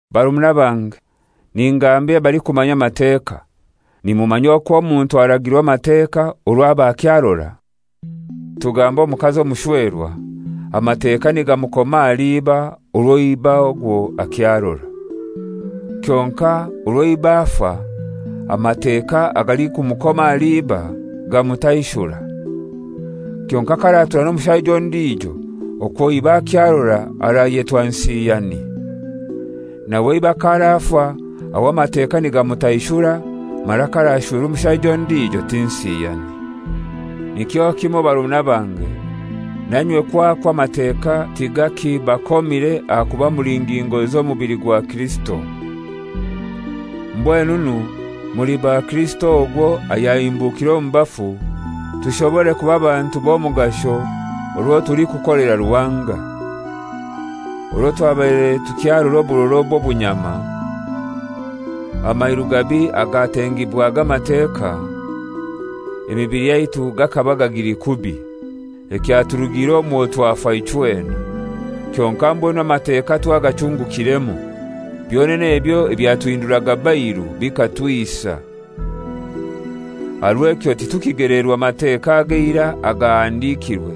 Barumuna bange, ningambira abalikumanya Amateka, nimumanya okw'omuntu aragirwa Amateka orwo aba akyarora? Tugambe omukazi omushwerwa, Amateka nigamukoma ahali iba orwo iba ogwo akyarora. Kyonkai orwo iba afa, Amateka agalikumukoma ahali iba gamutaishura. Kyonkai k'aratura n'omushaija ondijo okwo iba akyarora arayetwa nsiyani. Nawe iba k'arafa aho Amateka nigamutaishura, mara k'arashwerwa omushaija ondijo ti nsiyani. Nikyo kimoi barumuna bange, nainywe kwakwo Amateka tigakibakomire ahakuba muli ngingo z'omubili gwa Kirisito. Mbwenunu muli ba Kirisito ogwo ayahimbukire omu bafu tushobore kuba bantu b'omugasho orwo tulikukolera Ruhanga. Orwo twabaire tukyarora oburora obw'obunyama, amairu gabi agatengibwaga Amateka, emibili yaitu gakaba gagili kubi. Ekyaturugiire omwo twafa ichwena. Kyonkai mbwenu Amateka twagachungukiremu. Byonene ebyo ebyatuhinduraga bairu bikatwisa. Aha rw'ekyo titukigeleerwa Mateka ag'eirai agahandikirwe,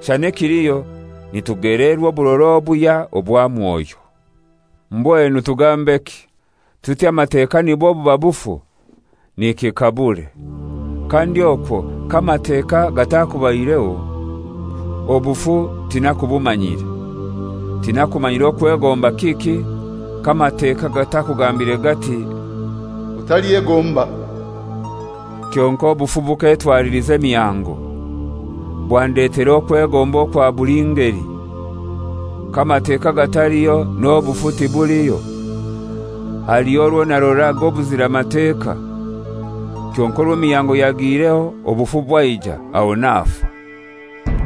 shana ekiliho nitugeleerwa oburora obuhya obwa Mwoyo. Mbwenu tugambeki? Tuti Amateka nibwo buba bufu? Nikikabure! Kandi okwo k'Amateka gatakubaireho, obufu tinakubumanyire. Tinakumanyire okwegomba kiki k'Amateka gatakugambire gati, «Otalyegomba.» Kyonkai obufu bukekwatiliza emihango, bwandetera okwegomba okwa buli ngeli. K'Amateka gataliho n'obufu tibuliho. Haliho orwo naroraga obuzira Mateka; kyonkai orwo emihango yagiireho, obufu bwaija, aho nafa.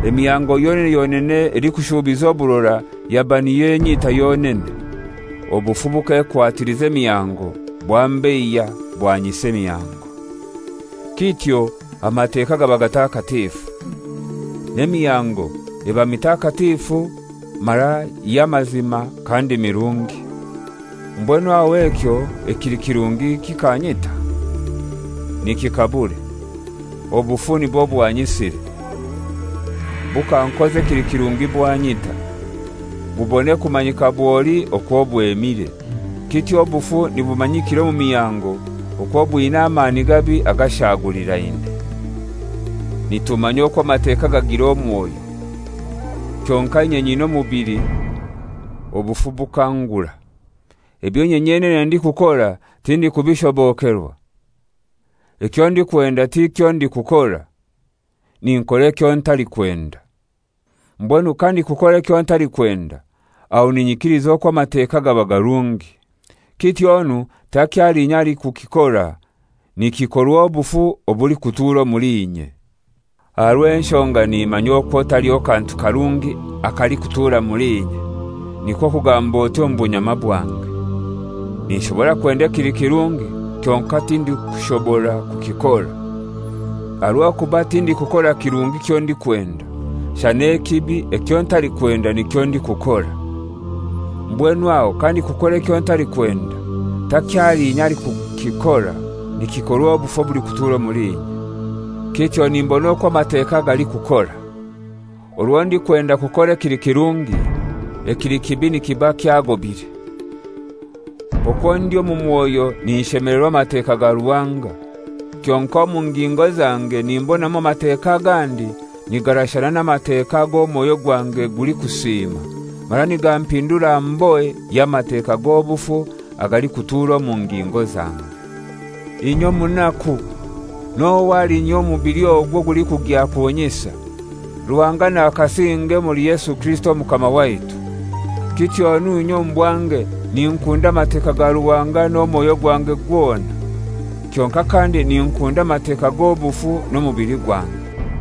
Emihango yonene yonene elikushuubiza oburora yaba niyo enyita yonene. Obufu bukekwatiliza emihango, bwambeiya bwanyisa emihango. Kityo Amateka gaba gatakatifu, n'emihango eba mitakatifu mara y'amazima kandi mirungi. Mbwenu aho ekyo ekili kirungi kikanyita? Nikikabure! Obufu nibwo bwanyisire. Bukankoza ekili kirungi bwanyita, bubone kumanyika bwoli okwo bwemire. Kityo obufu nibumanyikira omu mihango okwo bwina amani gabi agashaagulirane. Nitumanya okwo Amateka gagira omwoyo; kyonkai inye nyina omubili obufu bukangura. Ebyo inye nyenene ndikukora tindikubishobokerwa. Ekyo ndikwenda tikyo ndikukora; ninkora ekyo ntalikwenda. Mbwenu kandikukora ekyo ntalikwenda, aho ninyikiliza okwo Amateka gaba garungi. Kityonu takyali inye alikukikora, nikikorwa obufu obulikutuura omuli inye. Aha rw'enshonga nimanya okwo taliho kantu karungi akalikutura muli inye, nikwo kugamb'oti, omu bunyama bwange. Ninshobora kwenda ekili kirungi kyonkai tindikushobora kukikora. Aha rw'okuba tindikukora kirungi kyo ndikwenda, shana ekibi ekyo ntalikwenda nikyo ndikukora. Mbwenu aho kandikukora ekyo ntalikwenda, takyali inye alikukikora, nikikorwa obufu obulikutuura omuli inye. Kityo nimbona okwo Amateka galikukora: Orwo ndikwenda kukora ekili kirungi, ekili kibi nikiba kyagobire. Okwo ndi omu mwoyo ninshemelerwa Amateka ga Ruhanga, kyonkai omu ngingo zange nimbonamu Amateka agandi nigarashana n'Amateka ag'omwoyo gwange gulikusiima mara nigampindura mbohe y'Amateka g'obufu agalikutuura omu ngingo zange. Inye omunaku! N'ohai alinyihya omu mubili ogu ogulikugya kunyisa? Ruhanga nakasinge omuli Yesu Kirisito Omukama waitu! Kityonu inye omu bwange ninkunda Amateka ga Ruhanga n'omwoyo gwange gwona, kyonkai kandi ninkunda Amateka g'obufu n'omubili gwange.